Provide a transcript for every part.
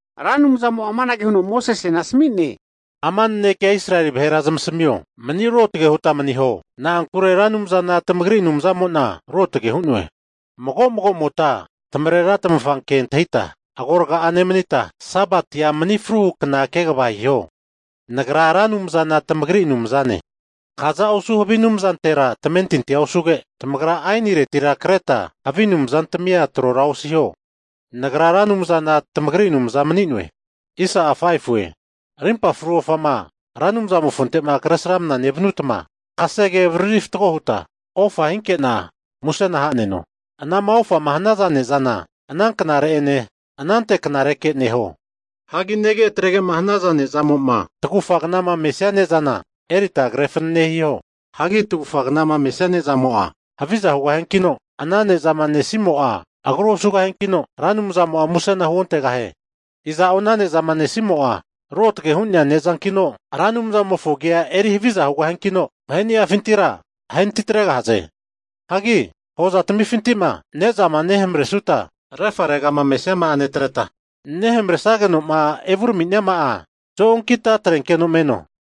Ra Anumzamo'a amanage huno Mosesena asami'ne, Ama nanekea Israeli vahera zamasamio, mani ruotage huta maniho, na'ankure Ra Anumzana tamagri Anumzamo'na ruotage hu'noe. Mago magomota tamarera tamafa ke antahita agoraga'a nemanita, Sabatia mani fruhu kna kegava hiho. Nagra Ra Anumzana tamagri Anumzane. Kaza osu havi anumzantera tamentintia osuge, tamagra ainiretira kreta havi anumzantamia trora osiho. Nagra Ra Anumzana tamagri Anumza mani'noe. Rimpa fru ofama Ra Anumzamofonte'ma kresramna nevanutma, kasege avariritma fatgo huta ofa hinke'na musena ha'neno. Anama ofama hanaza ne'zana ana knare'ene anante knareke neho. Hagi nege atrege'ma hanaza ne'zamo'ma tagufa knama mesia ne'zana erita kre fanane hiho. Hagi tagufa knama mesia ne'zamo'a haviza hugahiankino, ana ne'zama nesimo'a agru osugahiankino, Ra Anumzamo'a musena huontegahie. Iza'o ana ne'zama nesimo'a ruotage hu'nea ne'zankino Ra Anumzamofo agi'a eri haviza hugahiankino, vaheni'afintira ahenatitregahaze. Hagi hozatamifinti'ma ne'zama nehamaresuta refaregama me'nesiama'a netreta, nehamaresage'noma evuraminiama'a zo'onkita atrenkeno meno.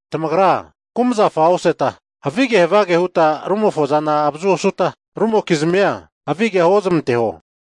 Tamagra kumazafa oseta, havige havage huta rumofozana avazua osuta, rumokizmia havigea huozmanteho.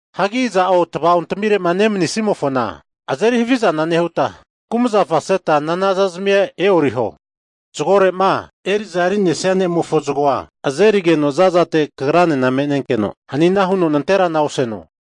Hagi iza'o tavaontamire'ma nemanisimofona azeri havizana nehuta, kumazafa seta nanazazmia e'oriho. Zagore'ma eri'za eri'nesia ne'mofo zagoa azerigeno zazatera kagranena me'nenkeno hanina huno nanterana oseno.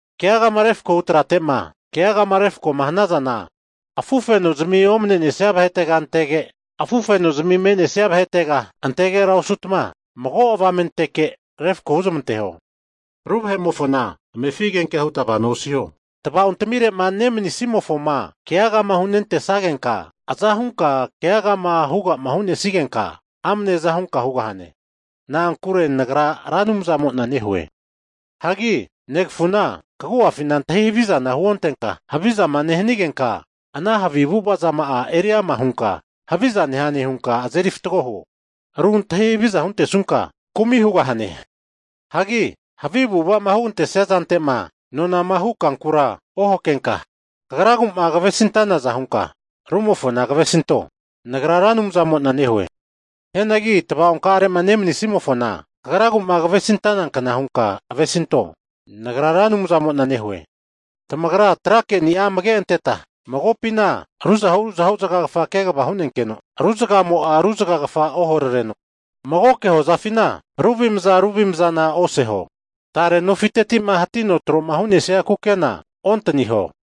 Keagama refko hu trate'ma keagama refkoma hanazana afufenozimi omne nesnia vahetega antege, afufenozimi me'nesnia vahetega antegera osutma, mago avamenteke refko huzmanteho. Ru vahe'mofo amefi agenkea huta vano osu tava'ontamire nemanisimofoma keagama hunentesagenka, azahunka keaga huga'ma hu'nesigenka amne aza hunka hugahane. Na'ankure Nagra Ra Anumzamo'na nehue. Hagi negafuna kagu'afina antahi havizana huontenka, havizama nehanigenka ana havi avu'avazama'a eri ama hunka haviza nehane hunka azeri fatgo huo. Ru antahi haviza huntesunka kumi hugahane. Hagi havi avu'ava'ma hugantesia zante'ma nonama hu kankura ohakenka, kagragu'ma kavesintanaza hunka rumofona kavesinto. Nagra Ra Anumzamo'na nehue. Hianagi tava'onkare'ma nemanisimofona kagragu'ma kavesintana kna hunka avesinto. Nagra Ra Anumzamo'na nehue. Tamagra tra keni'a amage'anteta, magopina ruzahu ruzahu zagagafa kegava hu'nenkeno ru zagagafamo'a ru zagagafa oharareno. Magoke hozafina ru avimzana ru avimzana oseho. Tare nofitetima hatino tro'ma hu'nesia kukena ontaniho.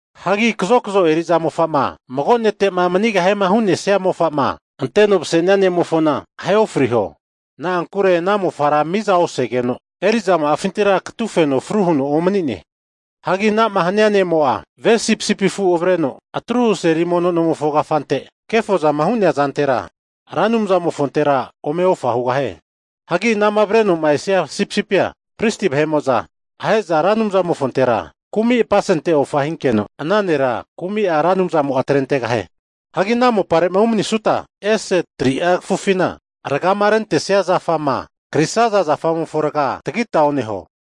Hagi kazokzo eri'za mofa'ma mago nete'ma manigahiema hu'nesia mofa'ma anteno mase'nia ne'mofona, ahe ofriho. Na'ankure ana mofara miza osazageno, eri'zama'afintira katufeno fru huno omani'ne. Hagi ana'ma hania ne'mo'a ve sipisipi afu avreno, atruhu seli mono nomofo kafante kefozama hu'nea zantera Ra Anumzamofontera ome ofa hugahie. Hagi anama avreno'ma esia sipisipia, pristi vahe'mo'za ahe'za Ra Anumzamofontera kumi'a apasente ofa hinkeno, ana nera kumi'a Ra Anumzamo'a atrentegahie. Hagi ana mopare'ma umanisuta, ese 3'a kafufina, rgama rente zafama krisaza zafamofo raga tagita oneho.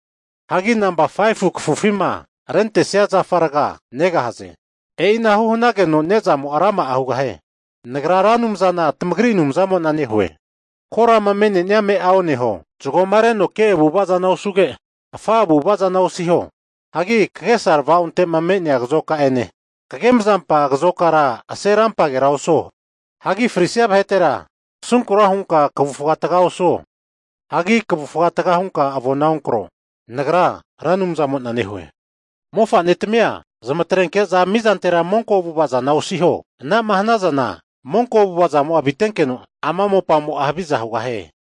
Hagi nampa 5fu kafufima rentesia zafa raga negahaze. E'inahu hanageno ne'zamo'a rama'a hugahie. Nagra Ra Anumzana tamagri Anumzamo'na nehue. Korama me'nenia ame'a oneho. Zagoma reno ke avu'ava zana osuge, afa avu'ava zana osiho. Hagi kagesa tavaonte'ma me'nea kazoka'ene kagemazampa kazokara ase rampagera osuo. Hagi frisia vahetera kasunkura hunka kavufga taga osuo. Hagi kavufga taga hunka avona onkro. Nagra Ra Anumzamo'na nehue. Mofanetami'a zamatrenke'za mizantera monko avu'ava zana osiho. Ana'ma hanazana monko avu'avazamo'a avitenkeno, ama mopamo'a haviza hugahie.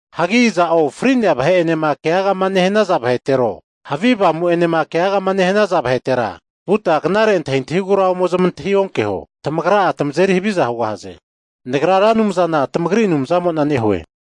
Hagi iza'o fri'nea vahe'enema keaga nehanaza vahetero, havi avamu'enema keagama nehanaza vahetera, vuta knare antahintahigura ome zamantahi onkeho. Tamagra'a tamazeri haviza hugahaze. Nagra Ra Anumzana tamagri Anumzamo'na nehue.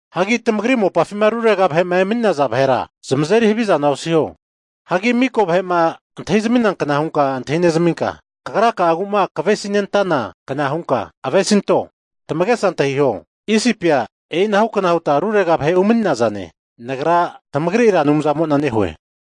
Hagi tamagri mopafima rurega vahe'ma emani'ne'naza vahera, zamazeri havizana osiho. Hagi miko vahe'ma antahi zaminankna hunka antahi neminka, kagra'agu'ma kavesinentanankna hunka avesinto Tamagesa antahiho, Isipia e'inahukna huta rurega vahe umani'nazane. Nagra tamagri Ra Anumzamo'na nehue.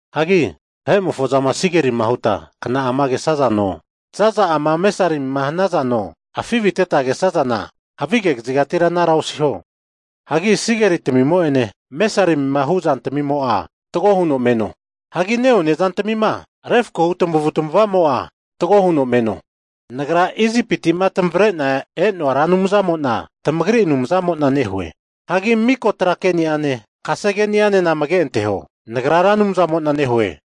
Hagi vahe'mofozama sigerima huta kna'ama kesazano, zaza'ama mesarimima hanazano, afiviteta kesazana havige kazigatira anara osiho. Hagi sigeritamimo'ene mesarimima hu zantamimo'a fatgo huno meno. Hagi ne'one zantamima refakohu tamavutamavamo'a, fatgo huno meno. Nagra Isipiti'ma tamavre'na e'noa Ra Anumzamo'na tamagri Anumzamo'na nehue. Hagi miko tra keniane, kasegeni'anena amage anteho. Nagra Ra Anumzamo'na nehue.